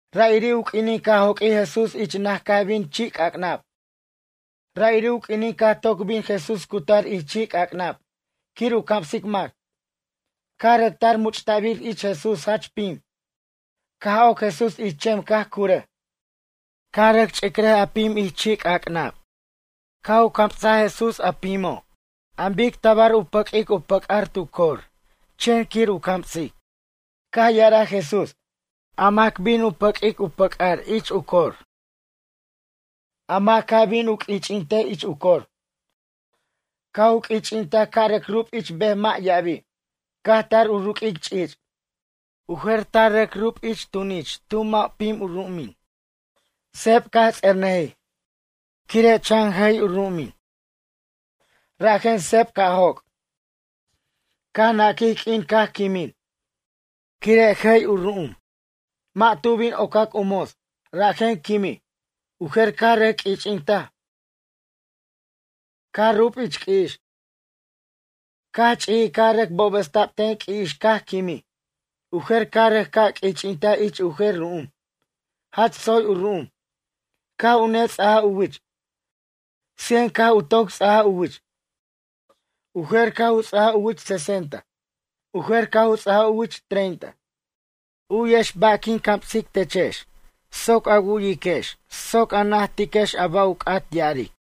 Ra'iri' u q'uinin caj joq'uij Jesús ich naj caj bin chi' c'ac'nab. Ra'iri' u q'uinin caj toc bin Jesús cutar ich chi' c'ac'nab quir u camsic mac. Caj rʌc tar much'ta'bir ich Jesús jach pim. Caj oc Jesús ich chem caj curʌj. Caj rʌc ch'icrʌj a pim ich chi' c'ac'nab. Caj u camsaj Jesús a pimo' an bic tabar u pʌq'uic u pʌc'ar tu cor chen quir u camsic. Caj ya'araj Jesús: ―Mac bin u pʌq'uic, u pʌc'ar ich u cor. A mac caj bin u q'uich'intej ich u cor. Caj u q'uich'intaj caj rʌc rub ich bej mʌ' ya'abi'. Caj tar u ruq'uic ch'ich'. U jer tar rʌc rube' ich tunich tu mʌ' pim u ru'umin. Seb caj ts'ejernʌji, quire' chan jay u ru'umin. Rajen seb caj joc'. Caj naquij q'uin caj quimin, quire' jay u ru'um. Mʌ' tu bin ocac u mos. Rajen quimij. U jer caj rʌc q'uich'intaj. Caj rub ich q'ui'ix. Caj ch'ijij caj rʌc bobʌsta'b ten q'ui'ix caj quimij. U jer caj u rʌc ca' q'uich'intaj ich u jer ru'um. Jach tsoy u ru'um. Caj u nets'aja u wich. Cien caj u toc ts'aj u wich. U jer caj u ts'aj u wich sesenta. U jer caj u ts'aja u wich treinta. U'yex ba' quin camsic techex soc a wu'yiquex soc a najtiquex a ba' u c'at ya'aric.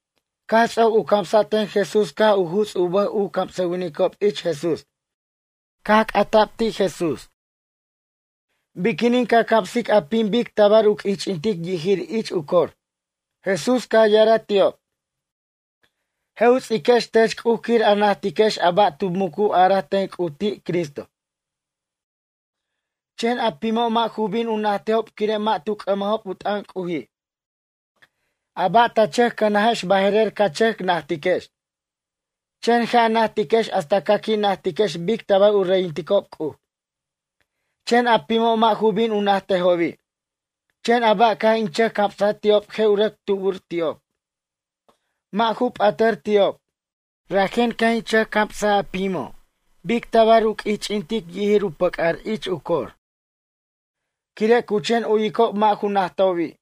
Caj ts'oc u camsa' ten Jesús caj u juts' u bʌj u camsʌwinicob ich Jesús. Caj c'ata' ti' Jesús: ―Biquinin ca camsic a pim bic tabar u q'uich'intic yijir ich u cor? Jesús caj ya'araj ti'ob: ―Je' u ts'iquex tech C'uj quir a najtiquex a ba' tu mucu araj ten C'uj ti' Cristo. Chen a pimo' mʌ' ju bin u najtejob quire' mʌ' tu c'ʌmajob u t'ʌn C'uji'. A ba' ta chʌc cʌnajex baje'rer ca chʌc najtiquex. Chen je' a najtiquex hasta ca qui' najtiquex bic tabar u reyinticob C'uj. Chen a pimo' mʌ' ju bin u najtejobi'. Chen a ba' caj in chʌc camsaj ti'ob je' u rʌc tubur ti'ob. Mʌ' ju p'atʌr ti'ob. Rajen caj in chʌc camsa a pimo' bic tabar u q'uich'intic yijir u pʌc'ar ich cor, quire' cu chen uyicob mʌ' ju najtobi'.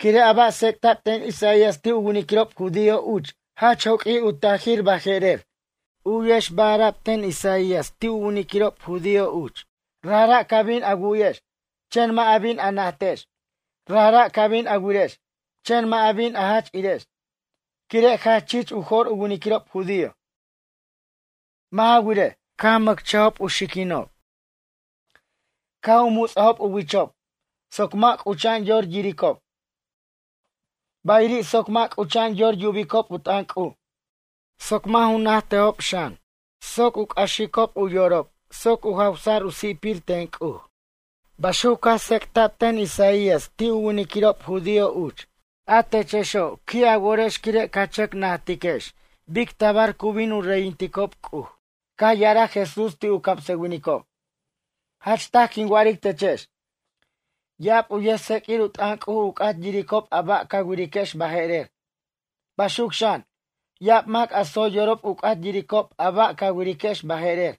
Quire' a ba' tsec'ta'b ten Isaías ti' u winiquirob judío uch jach joq'uij u tajir baje'rer. U'yex ba' ara'b ten Isaías ti' u winiquirob judío uch: Rajra' ca bin a wu'yex, chen mʌ' a bin a najtex. Rajra' ca bin a wirex, chen mʌ' a bin a jach irex. Quire' jach chich u jo'r u winiquirob judío. Mʌ' ja wirej, caj u mʌchajob u xiquinob, caj u muts'ajob u wichob soc mʌ' c'ucha'an yor yiricob. Bayiri' soc mʌ' c'ucha'an yor yubicob u t'ʌn C'uj, soc mʌ' ju najtejob xan. Soc u c'axicob u yorob soc u jawsa'r u si'pir ten C'uj. Baxuc caj tsec'ta'b ten Isaías ti' u winiquirob judío uch. A techexo', qui' a worex quire' ca chʌc najtiquex bic tabar cu bin u reyinticob C'uj. Caj ya'araj Jesús ti' u camsʌwinicob: ―Jach taj quin wa'aric techex. Ya'ab u yʌjtseq'uir u t'ʌn C'uj u c'at yiricob a ba' ca wiriquex baje'rer. Baxuc xan, ya'ab mac a tsoy yorob u c'at yiricob a ba' ca wiriquex baje'rer.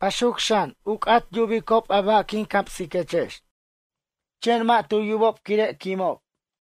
Baxuc xan, caj u c'at yubicob a ba' quin camsiquechex. Chen mʌ' tu yubob quire' quimob.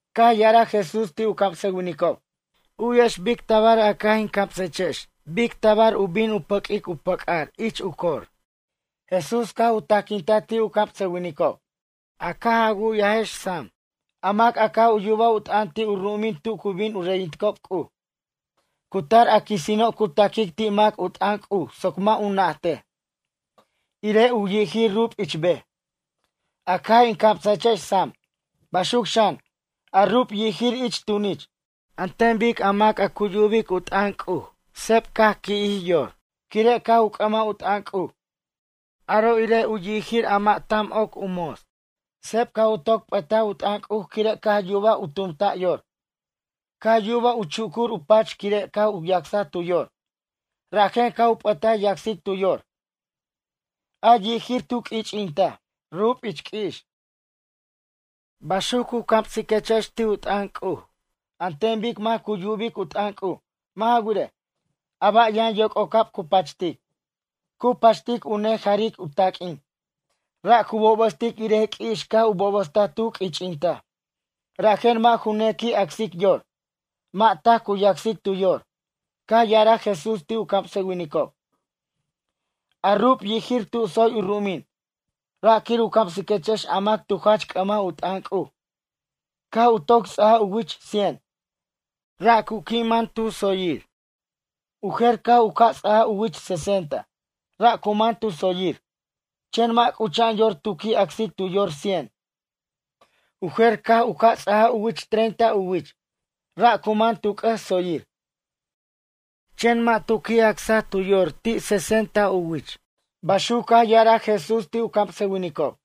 Caj ya'araj Jesús ti' u camsʌwinicob: ―U'yex bic tabar a caj in camsechex bic tabar u bin u pʌq'uic u pʌc'ar ich u cor. Jesús caj u tajquintaj ti' u camsʌwinicob: ―A caj a wu'yajex sam. A mac a caj yubaj in t'ʌn ti' u ru'umin tu cu bin u reyintejob C'uj. Cu tar a quisino' cu ta'quic ti' mac u t'ʌn C'uj soc mʌ' u najtej, irej u yijir rub ich bej, a caj in camsajechex sam. Baxuc xan, a rub yijir ich tunich, an ten bic a mac cu yubic u t'ʌn C'uj seb caj qui'jij yor, quire' caj u c'ʌmaj u t'ʌn C'uj. Aro' irej u yijir a mʌ' tam oc u mos. Seb caj u toc p'ʌtaj u t'ʌn C'uj quire' caj yubaj u tumtaj yor. Caj yub u chucur u pach quire' caj u yacsaj tu yor. Rajen caj u p'ʌta yacsic tu yor. A yijir tu q'uich'intaj, rub ich q'ui'ix. Baxuc cu camsiquechex ti' u t'ʌn C'uj, an ten bic mac cu yubic u t'ʌn C'uj. Mʌ' ja wirej, a ba' yʌn yoc'ocab cu pachtic. Cu pachtic u neja'ric u taq'uin, ra' cu bobʌstic irej q'ui'ix caj u bobʌstaj tu q'uich'intaj. Rajen mʌ' ju nequi' acsic yor. Mʌ' taj cu yacsic tu yor. Caj ya'araj Jesús ti' u camsʌwinicob: ―A rub yijir tu tsoy u ru'umin, ra' quir u camsiquechex a mac tu jach c'ʌmaj u t'ʌn C'uj. Caj u toc ts'aja u wich cien. Ra' cu qui' man tu tsoyir. U jer caj u ca' ts'aja u wich sesenta. Ra' cu man tu tsoyir, chen mʌ' c'ucha'an yor tu qui' acsic tu yor cien. U jer caj u ca' ts'ajaj u wich treinta u wich. Ra' cu man tu c'ʌs tsoyir, chen mʌ' tu qui' acsaj tu yor ti' sesenta u wich ―baxuc caj ya'araj Jesús ti' u camsʌwinicob.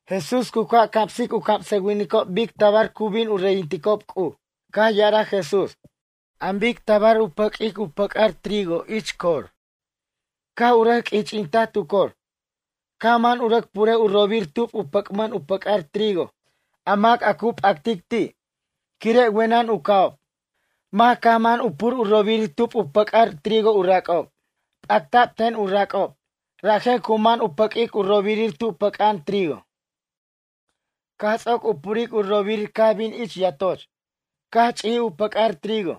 Jesús cu ca' camsic u camsʌwinicob bic tabar cu bin u reyinticob C'uj. Caj ya'araj Jesús: ―An bic tabar u pʌq'uic u pʌc'ar trigo ich cor. Caj u rʌc q'uich'intaj tu cor. Caj man u rʌc purej u robir tub u pʌc'man u pʌc'ar trigo a mac a cu p'actic ti'. Quire' wenʌn u ca'ob, mac caj man u pur u robirir tub u pʌc'ar trigo u rac'ob. P'acta'b ten u rac'ob, rajen cu man u pʌq'uic u robir tu pʌc'a'an trigo. Caj ts'oc u puric u robir caj bin ich yatoch. Caj ch'ijij u pʌc'ar trigo,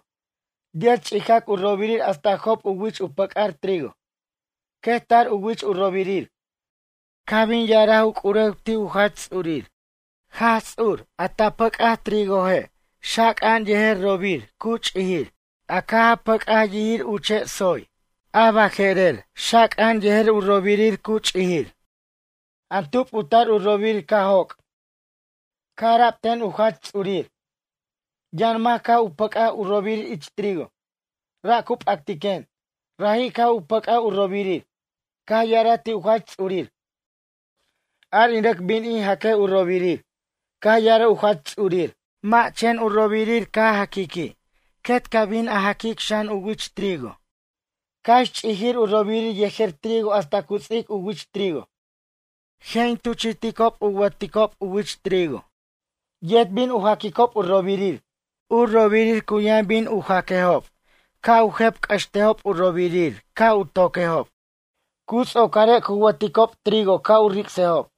yet ch'ijac u robirir hasta job u wich u pʌc'ar trigo. Quet tar u wich u robirir. Caj bin ya'araj u c'urew ti' u jach ts'urir: “A ta pʌc'aj trigoje' Jach Ts'ur, xaca'an yejer robirir cu ch'ijir. A caj a pʌc'aj yirir uche' tsoy. U ch'ijir a baje'rer yʌn u robirir xaca'an. An tub u tar u robirir caj joc'?” Caj ara'b ten u jach ts'urir: “Yʌn mac caj u pʌc'aj u robirir ich trigo. Ra' cu p'actiquen. Raji' caj u pʌc'aj u robirir.” Caj ya'araj ti' u jach ts'urir: “Ar in rʌc bin in jaquej u robirir.” Caj ya'araj u jach ts'urir: “Mʌ', chen u robirir ca jaquiqui' quet ca bin a jaquic xan u wich trigo. Cax ch'ijir u robirir yejer trigo hasta cu ts'ic u wich trigo. Je' in tuchi'ticob u wʌticob u wich trigo, yet bin u jaquicob u robirir. U robirir cu yʌn bin u jaquejob ca' u jep' c'ʌxtejob u robirir ca' u toquejob. Cu ts'ocare' cu wʌticob trigo ca' u ric'sejob.”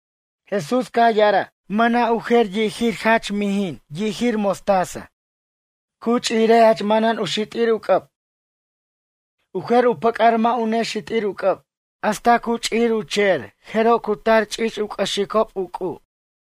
Jesús caj ya'araj: ―Mʌna' u jer yijir jach mijin yijir mostaza. Cu ch'ijire' jach manan u xit'ir u c'ʌb. U jer u pʌc'ar mʌ' u nexit'ir u c'ʌb. Hasta ch'ijir u che'er jeroj cu tar ch'ich' u c'ʌxicob u c'u'.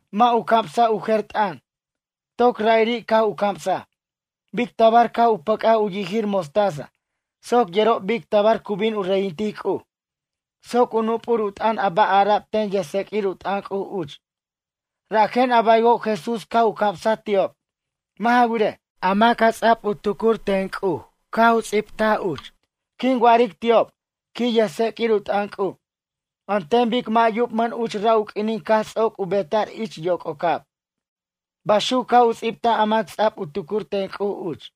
Mʌ' u camsa' u jer t'ʌn. Toc ra'iri' caj u camsaj. Bic tabar caj u pʌc'aj u yijir mostaza soc yerob bic tabar cu bin u reyintic C'uj. Soc u nup'ur u t'ʌn a ba' ara'b ten yʌjtseq'uir u t'ʌn C'uj uch, rajen a baywo' Jesús caj u camsaj ti'ob. Mʌ' ja wirej, a mac a ts'a'b u tucur ten C'uj caj u ts'ibtaj uch: Quin wa'aric ti'ob, quij yʌjts'eq'uir u t'ʌn C'uj, an ten bic mʌ' yubmʌn uch ra' u q'uinin caj ts'oc u beta'r ich yoc'ocab. Baxuc caj u ts'ibtaj a mac ts'a'b u tucur ten C'uj uch.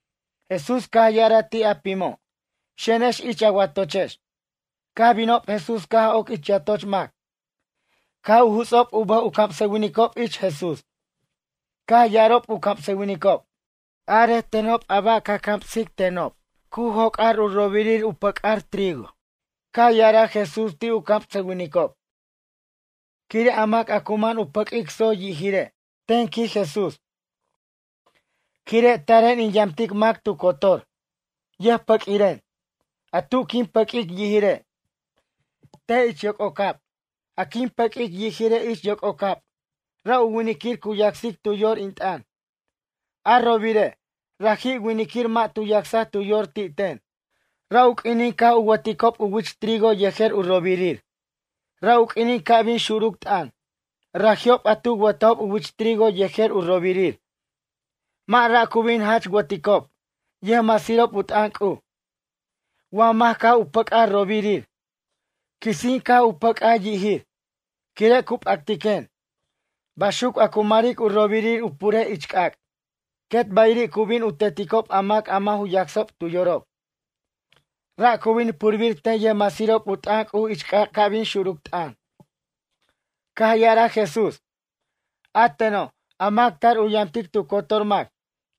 Jesús caj ya'araj ti' a pimo': ―Xenex ich a watochex. Caj binob Jesús caj oc ich yatoch mac. Caj u juts'ob u bʌj u camsʌwinicob ich Jesús. Caj ya'arob u camsʌwinicob: ―Arej tenob a ba' ca camsic tenob cu joc'ar u robirir u pʌc'ar trigo. Caj ya'araj Jesús ti' u camsʌwinicob: ―Quire' a mac a cu man u pʌq'uic tsoy yijire', ten ―quij Jesús―. Quire' taren in yamtic mac tu cotor. Yʌjpʌq'uiren. A tu quin pʌq'uic yijire', te' ich yoc'ocab. A quin pʌq'uic yijire' ich yoc'ocab, ra' u winiquir cu yacsic tu yor in t'ʌn. A robirire', raji' winiquir mʌ' tu yacsaj tu yor ti' ten. Ra' u q'uinin caj u wʌticob u wich trigo yejer u robirir, ra' u q'uinin ca' bin xuruc t'ʌn. Raji'ob a tu wʌtajob u wich trigo yejer u robirir. Mʌ' ra' cu bin jach wʌticob, yʌjmasirob u t'ʌn C'uj. Wa mac caj u pʌc'aj robirir, quisin caj u pʌc'aj yijir, quire' cu p'actiquen. Baxuc a cu maric u robirir u purejob ich c'ac'. Quet bayiri' cu bin u teticob a mac mʌ' ju yacsob tu yorob. Ra' cu bin purbir ten yʌjmasirob u t'ʌn C'uj ich c'ac' ca' bin xuruc t'ʌn. Caj ya'araj Jesús: ―A teno', a mac tar u yamtic tu cotor mac.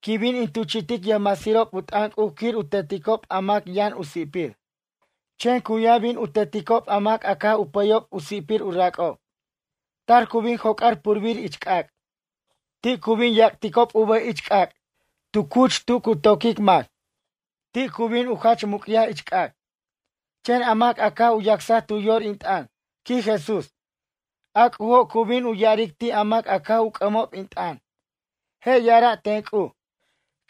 Quin bin in tuchi'tic yʌjmasirob u t'ʌn C'uj quir u teticob a mac yʌn u si'pir. Chen cu yʌn bin u teticob a mac a caj u pʌyob u si'pir u rac'ob. Tar cu bin joc'ar purbir ich c'ac'. Ti' cu bin yac'ticob u bʌj ich c'ac' tu cuch tu cu to'quic mac. Ti' cu bin u jach muc'yaj ich c'ac'. Chen a mac a caj u yacsaj tu yor in t'ʌn ―quij Jesús―, a C'ujo' cu bin ya'aric ti' a mac a caj u c'ʌmob in t'ʌn. Je' ya'ara' ten C'uj: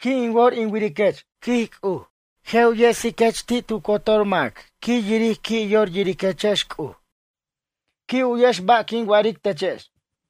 ―Qui' in wor in wiriquech ―quij C'uj―. Je' u yesiquech ti' tu cotor mac quir yiric qui' yor yiriquechex C'uj. Qui' u'yex ba' quin wa'aric techex.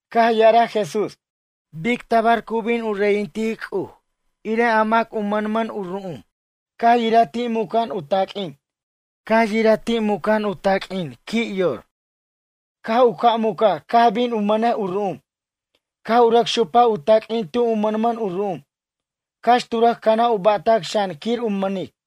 Caj ya'araj Jesús: ―Bic tabar cu bin u reyintic C'uj irej a mac a mʌnmʌn u ru'um, caj yiraj ti' muca'an u taq'uin. Caj yiraj ti' muca'an u taq'uin qui' yor. Caj u ca' mucaj caj bin u mʌnej u ru'um. Caj u rʌc xupaj u taq'uin tu u mʌnmʌn u ru'um. Cax tu rʌc canaj u ba'tac xan quir u mʌnic.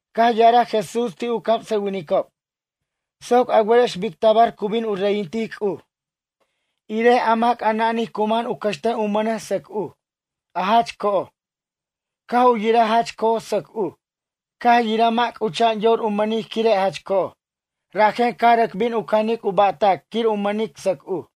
Caj ya'araj Jesús ti' u camsʌwinicob: ―Soc a werex bic tabar cu bin u reyintic C'uj. Irej a mac a nanij cu man u cʌxtej u mʌnej sʌc uj, a jach co'oj. Caj u yiraj jach co'oj sʌc uj, caj yiraj mʌ' c'ucha'an yor u mʌnic quire' jach co'oj. Rajen caj rʌc bin u canic u ba'tac quir u mʌnic sʌc uj.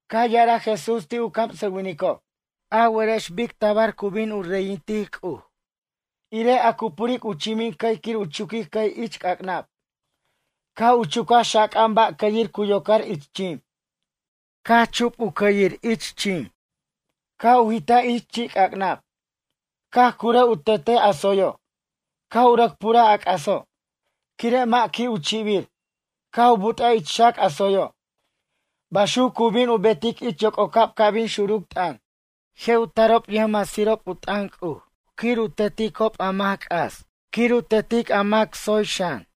Caj ya'araj Jesús ti' u camsʌwinicob: ―A werex bic tabar cu bin u reyintic C'uj. Irej a cu puric u chimin cʌy quir u chuquic cʌy ich c'ac'nab. Caj u chucaj xaca'an ba' cʌyir cu yocar ich chim. Caj chup u cʌyir ich chim, caj u jitaj ich chi'c'ac'nab. Caj curʌj u tetej a tsoyo', caj u rʌc puraj a c'aso', quire' mʌ' qui' u chi'bir. Caj u but'aj ich xac a tsoyo'. Baxuc cu bin u betic ich yoc'ocab ca' bin xuruc t'ʌn. Je' u tarob yʌjmasirob u t'ʌn C'uj quir u teticob a mac c'as quir u tetic a mac tsoy xan.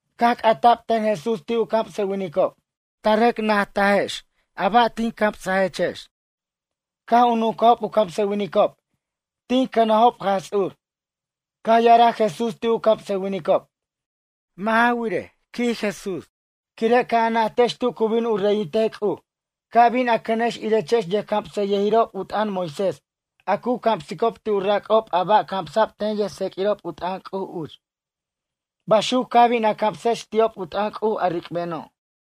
Caj c'ata'b ten Jesús ti' u camsʌwinicob: ―Ta rʌc najtajex a ba' tin camsajechex? Caj u nuncajob u camsʌwinicob: ―Tin cʌnajob Jaj Ts'ur. Caj ya'araj Jesús ti' u camsʌwinicob: ―Mʌ' ja wirej ―quij Jesús―. Quire' caj a najtex tu cu bin u reyintej C'uj ca' bin a cʌnex irechex yʌjcamsʌyʌjirob u t'ʌn Moisés a cu camsicob ti' u rac'ob a ba' camsa'b ten yʌjtseq'uirob u t'ʌn C'uj uch. Baxuc ca bin a camsex ti'ob u t'ʌn C'uj a ric'beno'.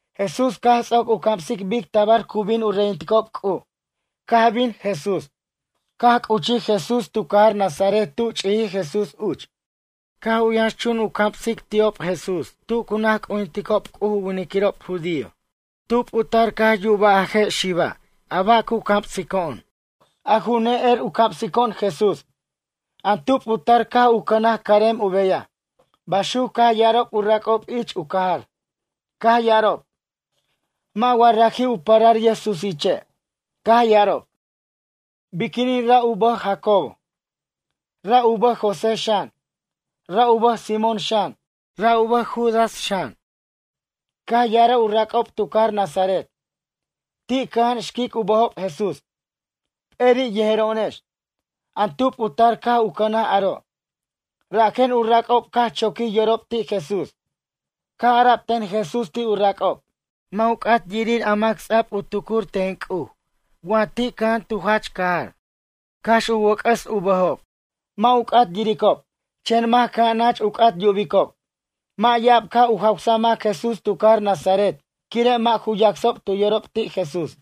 Jesús caj ts'oc u camsic bic tabar cu bin u reyinticob C'uj caj bin Jesús. Caj c'uchij Jesús tu cajar Nazaret tu ch'ijij Jesús uch. Caj u yʌnxchun u camsic ti'ob Jesús tu cu naj c'ujinticob C'uj u winiquirob judío: ―Tub u tar caj yubaj a je' xiba' a ba' cu camsico'on? A ju ne'er u camsico'on Jesús. An tub u tar caj u cʌnaj carem u beyaj ―baxuc caj ya'arob u rac'ob ich u cajar. Caj ya'arob: ―Mʌ' wa raji' u parar yʌjsusiche'? Caj ya'arob: ―Biquinin ra' u bʌj Jacobo. Ra' u bʌj José xan. Ra' u bʌj Simón xan. Ra' u bʌj Judas xan. Caj ya'araj u rac'ob tu cajar Nazaret: ―Ti' cʌja'an xquic u bʌjob Jesús. P'eri' yejero'onex. An tub u tar caj u cʌnaj aro'? Rajen u rac'ob caj choquij yorob ti' Jesús. Caj ara'b ten Jesús ti' u rac'ob: ―Mʌ' u c'at yirir a mac ts'a'b u tucur ten C'uj wa ti' cʌja'an tu jach cajar. Cax u wʌc'ʌs u bʌjob, mʌ' u c'at yiricob. Chen mac cʌja'an nach u c'at yubicob. Mʌ' ya'ab caj u jawsa mac Jesús tu cajar Nazaret quire' mʌ' ju yacsob tu yorob ti' Jesús.